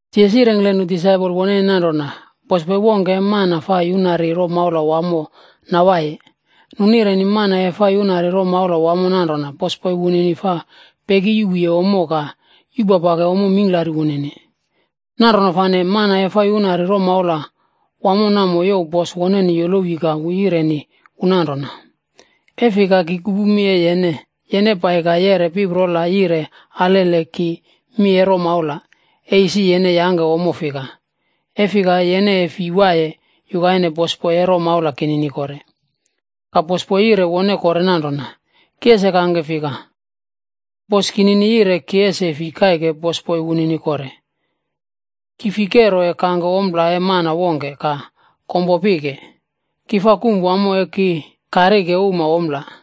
Jisas yirengkle nu disaipol woneni nanrona, “Bosboi wongke e mana fa yunari romaula wamo nawaiye. Nu nireni mana e fa yunari romaula wamo nanrona bosboi wunini fa peki yuꞌpuye ommo ka yupapake ommo mingklari wunini. Nanrona fane mana e fa yuna romaula wamo namo youw bosboi woneni yolowi ka wu yireni wu nanrona, ‘E fika ka ki kupu mi e yene? Yene pai ka yeꞌre piprola yire alele ki mi e romaula, e isi yene yangke ommo fika. E fika, yene e fi waiye yukaine bosboi e romaula kinini kore.’ “Ka bosboi yire wone kore nanrona, ‘Ki ese kangke fika? Bos kinini yire ki ese fi kaike bosboi wunini kore. Ki fi kero e kangke ompla e mana wongke ka kompo pike. Ki fa kum wamo e ki karike uma ompla.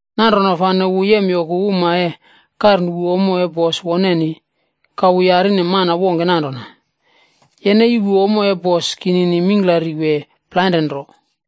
“Nanrona fane wu yemyoku uma e karnuꞌpu ommo e bos woneni. Ka wu yarine mana wongke nanrona, ‘Yene yuꞌpu ommo e bos kinini mingklari wee plainre nro?’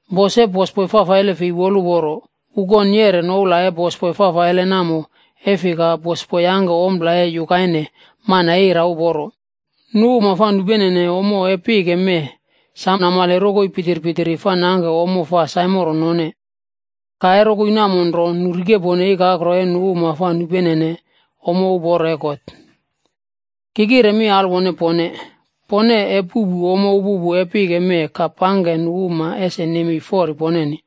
“Bos e bosboi fafaile fei woluporo, wu kon yereri noula e bosboi fafaile namo e fika bosboi yangke ompla e yukaine mana e ira uporo. Nu uma fa nupenene ommo e pike mee sam namale rokoi pitirpitiri fa nangke ommo fa saimoro none, ka e rokoi namo nro nu rikepone ikakro e nu uma fa nupenene ommo uporo e God. Ki kire mi alwone pone, pone e puꞌpu ommo upupu e pike mee ka pangke nu uma ese nemei fori poneni.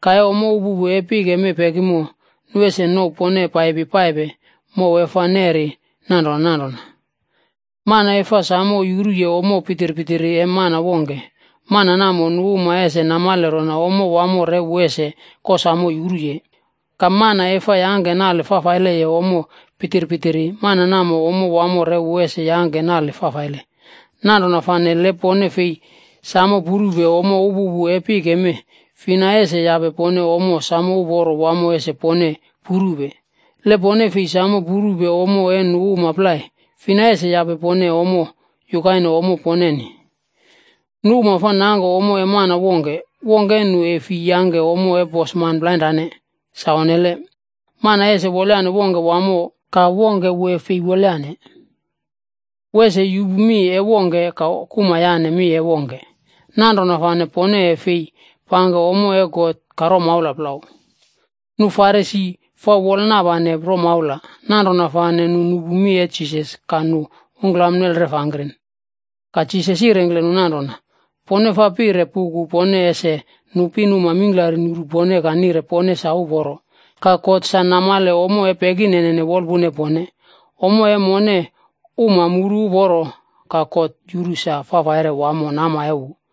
Ka e ommo upupu e pike mee pekimo, nu ese nouw pone paipi paipe mow e fa neri nanrona nanrona. “Mana e fa sam yuruye ommo pitirpitiri e mana wongke, mana namo, nu uma ese namale rona ommo wamo re wu ese kosamo yuruye. Ka mana e fa yangke nale fafaileye ommo pitirpitiri, mana namo, ommo wamo re wu ese yangke nale fafaile. Nanrona fane le pone fei samo purupe ommo upupu e pike mee, fina ese yape pone ommo sam uporo wamo ese pone purupe? Le pone fei sam purupe ommo e nu uma plai, fina ese yape pone ommo yukaine ommo poneni? “Nu uma fa nangke ommo e mana wongke, wongke e nu e fi yangke ommo e bosman plainrane, sa onnele. Mana ese wolyane wongke wamo ka wongke wu e fei wolyane. Wu ese yupu mi e wongke, ka kuma yane mi e wongke. Nanrona fane pone e fei pangke ommo e God ka romaula plau.” Nu uma Farisi fa wolnapane romaula. Nanrona fane nu nupu mi e Jisas ka nu ungkla nelref angkren. Ka Jisas yirengkle nu nanrona, “Pone fa pire puku pone ese nu pinuma mingklari nuru pone ka nire pone sa uporo. Ka God sa namale ommo e pekinene wolpuna e pone. Ommo e mone uma muru uporo, ka God yuru sa fafaire wamo nama e wu.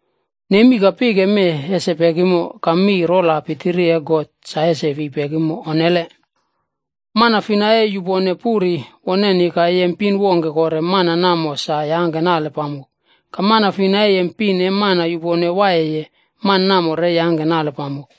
Nemi ka pike mee ese pekimo, ka mi rol pitiri e God sa ese fi pekimo. Onnele! “Mana fina e yupone puri woneni ka yem pin wongke kore, mana namo sa yangke nale pamok. Ka mana fina e yem pin e mana yupone waiyeye, mana namo re yangke nale pamok.”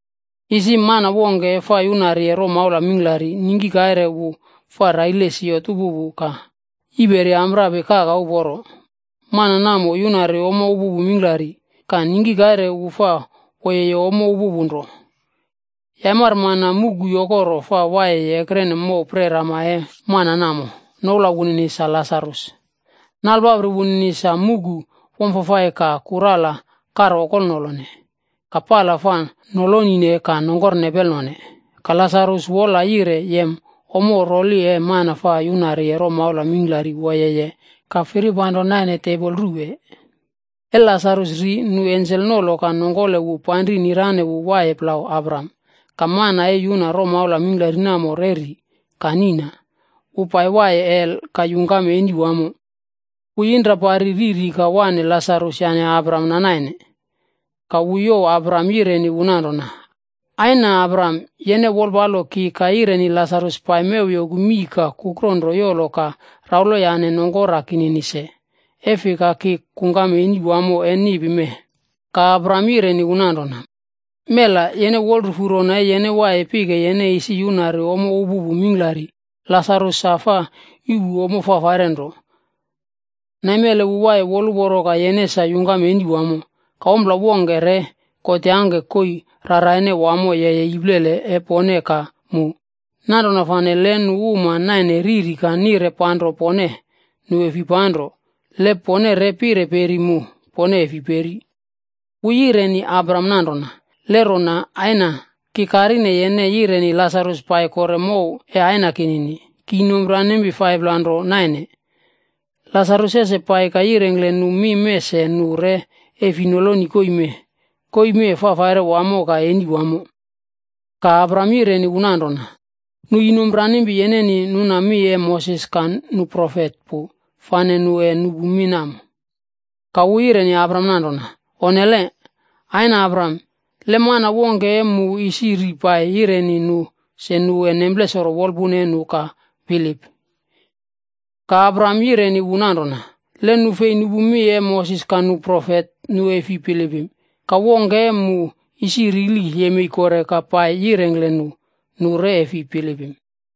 “Isi mana wongke fa yunariye romaula mingklari, ningki kaire wu fa raile siot upupu ka yiperi amprapi kaka uporo. Mana namo yunari ommo upupu mingklari. Ka ningki kaire wu fa woyeye ommo upupu nro. Yaimari mana muꞌku yokoro fa wiye ekrene mow prerama e mana namo, noula wunini sa Lasarus. Nalpapri wunini sa muꞌku wamfafai ka kurala karokolnolone, ka pala fa nolonine ka nongkor nepelnone. Ka Lasarus wola yire yem ommo roli e mana fa yunari romaula mingklari woyeye ka firpanro naine tebol ruwe. “E Lasarus ri, nu ensel nolo ka nongkole wu panri nirane wu yane Abraham naine. Ka mana e yuna romaula mingklari namo re ri ka niꞌna. Wu pai waiye hel ka yungkam eni wamo. Wu yinrapari riri ka wane Lasarus yane Abraham nainene. Ka wu youw Abraham yireni wu nanrona, ‘Aina Abraham, yene wolpalo ki ka yireni Lasarus pai mew yoku mii ka kukro nro yolo ka rauloyane nongkora kinini se, e fika ki kungkam eni wamo e niꞌpi mee.’ “Ka Abraham yireni wu nanrona, ‘Mela! Yene wolrufu rona e yene waiye pike, yene isi yunari ommo upupu mingklari. Lasarus sa fa yuꞌpu ommo fafaire nro. Naimele wu waiye woluporo ka yene sa yungkam eni wamo. Ka ompla wongke re God yangke koii raraine wamo yeye iplele e pone ka mu. Nanrona fane, le nu uma naine riri ka nire panro pone, nu e fi panro. Le pone re pire peri mu, pone e fi peri.’ “Wu yireni Abraham nanrona, ‘Le rona, aina, ki karine yene yireni Lasarus pai kore mow e aina kinini. Ki inompranimpi 5pla nro naine. Lasarus ese pai ka yirengkle nu mi mee se nu re e fi noloni koii mee. Koii mee fafaire wamo ka eni wamo.’ “Ka Abraham yireni wu nanrona, ‘Nu inomranimpi yeneni nuna mi e Moses ka nu profetb pu fane nu e nupu mi namo.’ “Ka wu yireni Abraham nanrona, ‘Onnele! Aina Abraham, le mana wongke e mu isi ri pai yireni nu se nu e nemplesoro wolpuna e nu ka bilip.’ “Ka Abraham yireni wu nanrona, ‘Le nu fei nupu mi e Moses ka nu profet, nu e fi bilipim. Ka wongke e mu uma isi rili yemei kore ka pai yirengkle nu, nu re e fi bilipim.’”